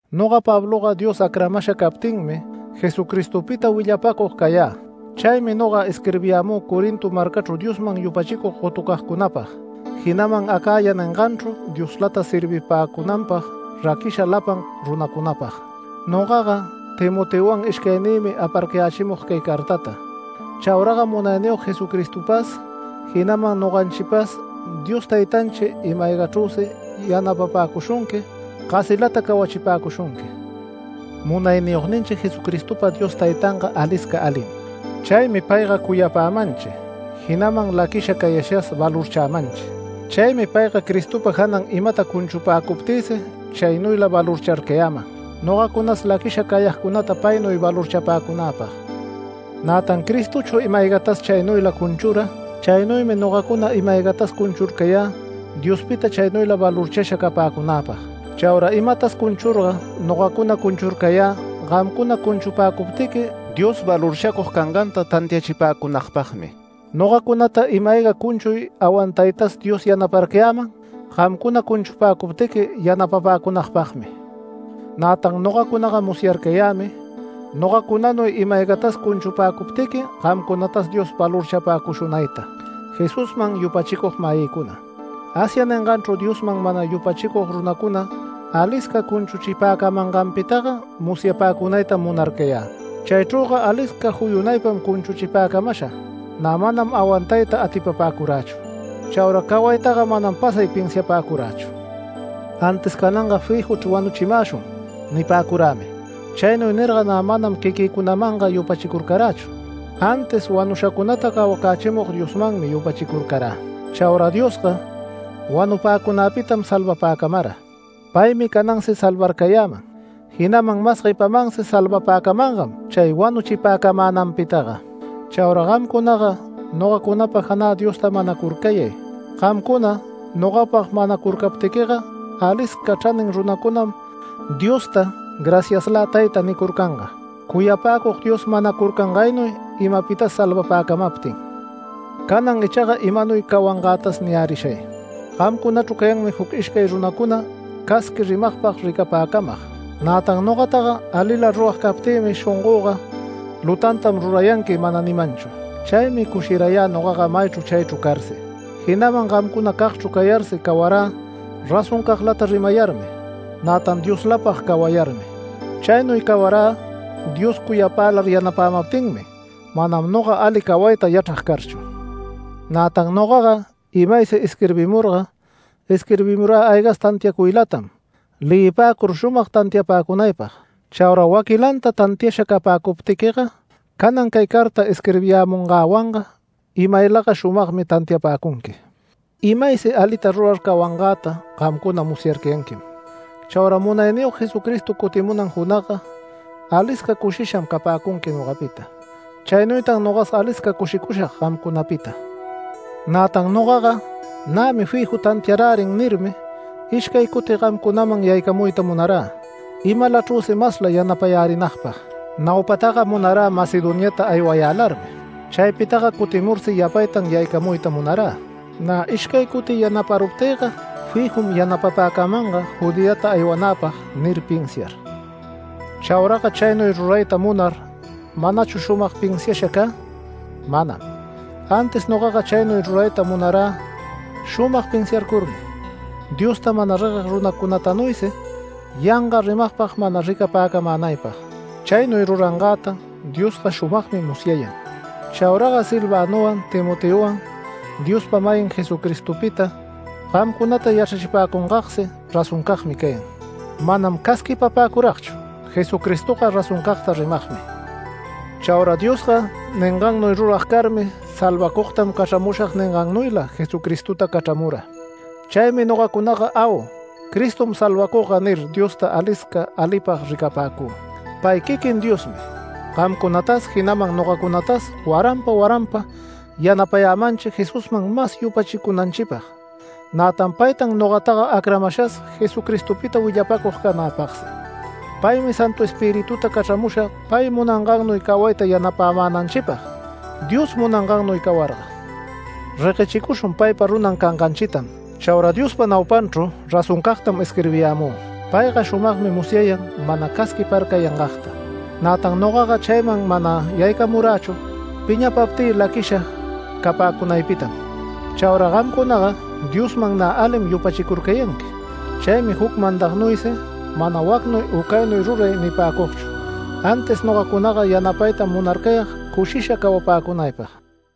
Noga Pabloga Dios acramasha captinmi Jesucristopita willapacug cayä. Chaymi noga isquirbiyämü Corinto marcachru Diosman yupachicug gotucagcunapag, jinaman ‘Acaya’ ninganchru Dioslata servipäcunanpag raquisha lapan runacunapag. Nogaga Timoteowan ishcaynïmi aparcayächimug cay cartata. Chauraga Munayniyog Jesucristopas, jinaman noganchipas Dios Taytanchi ima-aygachrüsi yapapäcushunqui, gasilata cawachipäcushunqui. Munayniyogninchi Jesucristopa Dios Taytanga alisca alim. Chaymi payga cuyapämanchi, jinaman laquisha cayashas valorchämanchi. Chaymi payga Cristopa janan imata cunchupäcuptïsi chaynuyla valorcharcayäman, nogacunas laquisha cayagcunata paynuy valorchapäcunäpag. Nätan Cristochu ima-aygatas chaynuyla cunchura. Chaynuymi nogacuna ima-aygatas cunchurcayä Diospita chaynuyla valorchasha capäcunäpag. Chaura imatas cunchurga nogacuna cunchurcayä gamcuna cunchupäcuptiqui Dios valorchacug canganta tantiachipäcunagpagmi. Nogacunata ima-ayga cunchuy awantaytas Dios yanaparcayäman gamcuna cunchupäcuptiqui yanapapäcunagpagmi. Nätan nogacunaga musyarcayämi nogacunanuy ima-aygatas cunchupäcuptiqui gamcunatas Dios valorchapäcushunayta. Jesusman yupachicug-mayïcuna, Asia ninganchru Diosman mana yupachicug runacuna alisca cunchuchipäcamanganpitaga musyapäcunaytam munarcayä. Chaychrüga alisca juyunaypam cunchuchipäcamasha, nä manam awantayta atipapäcurächu. Chaura cawaytaga manam pasay pinsiapäcurächu. Antis “Cananga fijuchr wanuchimäshun” nipäcurämi. Chaynuy nirga nä manam quiquïcunamanga yupachicurächu, antis wanushacunata cawacächimug Diosmanmi yupachicurcarä. Chaura Diosga wanupäcunäpitam salvapäcamara. Paymi canansi salvarcayäman, jinaman mas guepamansi salvapäcamangam chay wanuchipäcamänanpitaga. Chaura gamcunaga nogacunapa janä Diosta manacurcayay, gamcuna nogapag manacurcaptiquiga alisca chranin runacunam Diosta “Graciaslä Tayta” nicurcanga, cuyapäcug Dios manacurcangaynuy imapitas salvapäcamaptin. Canan ichaga imanuy cawangätas niyärishay: Gamcunachru cayanmi juc ishcay runacuna casqui rimagpag ricapäcamag. Nätan nogataga alila rurag captïmi shongöga “Lutantam rurayanqui” mana nimanchu. Chaymi cushirayä nogaga maychru chaychru carsi, jinaman gamcunacagchru cayarsi cawarä razoncaglata rimayarmi, nätan Dioslapag cawayarmi. Chaynuy cawarä Dios cuyapämälar yanapämaptinmi, manam noga ali cawayta yachrag carchu. Nätan nogaga imaysi isquirbimurga isquirbimurä aygas tantiacuylatam leyipäcur shumag tantiapäcunaypag. Chaura waquilanta tantiasha capäcuptiquiga canan cay carta isquirbiyämungäwanga imaylaga shumagmi tantiapäcunqui. Imaysi alita rurar cawangäta gamcunaga musyarcayanquim. Chaura Munayniyog Jesucristo cutimunan junagga alisca cushisham capäcunqui nogapita. Chaynuytan nogas alisca cushicushag gamcunapita. Nätan nogaga “Nämi fiju tantiarärin” nirmi ishcay cuti gamcunaman yaycamuyta munarä imalachrüsi masla yanaparärinagpag. Naupataga munarä Macedoniata aywayälarmi, chaypitaga cutimursi yapaytan yaycamuyta munarä, nä ishcay cuti yanaparuptiquiga “Fijum yanapapäcamanga Judeata aywanäpag” nir pinsiar. Chauraga chaynuy rurayta munar, ¿manachu shumag pinsiasha cä? Manam. Antis nogaga chaynuy rurayta munarä shumag pinsiarcurmi, Diosta mana regueg runacunatanuysi yanga rimagpag mana ricapäcamänaypag. Chaynuy rurangäta Diosga shumagmi musyayan. Chauraga Silvanowan Timoteowan Diospa-mayin Jesucristopita gamcunata yachrachipäcungagsi razoncagmi cayan. Manam casquipapäcuragchu Jesucristoga razoncagta rimagmi. Chaura Diosga ningannuy rurag carmi ‘Salvacugtam cachramushag’ ningannuyla Jesucristota cachramura. Chaymi nogacunaga “Au, Cristom salvacugga” nir, Diosta alisca alipag ricapäcü. Pay quiquin Diosmi gamcunatas jinaman nogacunatas waranpa waranpa yanapayämanchi Jesusman mas yupachicunanchipag, nätan paytan nogataga acramashas Jesucristopita willapäcug canäpagsi. Paymi Santu Espirituta cachramusha pay munangannuy cawayta yanapämänanchipag. Dios munangannuy cawarga, reguechicushun paypa runan canganchitam. Chaura Diospa naupanchru razoncagtam isquirbiyämü. Payga shumagmi musyayan mana casquiparcayangagta. Nätan nogaga chayman mana yaycamurächu piñapaptï laquisha capäcunaypitam. Chaura gamcunaga Diosman nä alim yupachicurcayanqui. Chaymi juc mandagnuysi mana “Wacnuy u caynuy ruray” nipäcugchu, antis nogacunaga yanapaytam munarcayag cushisha cawapäcunaypag.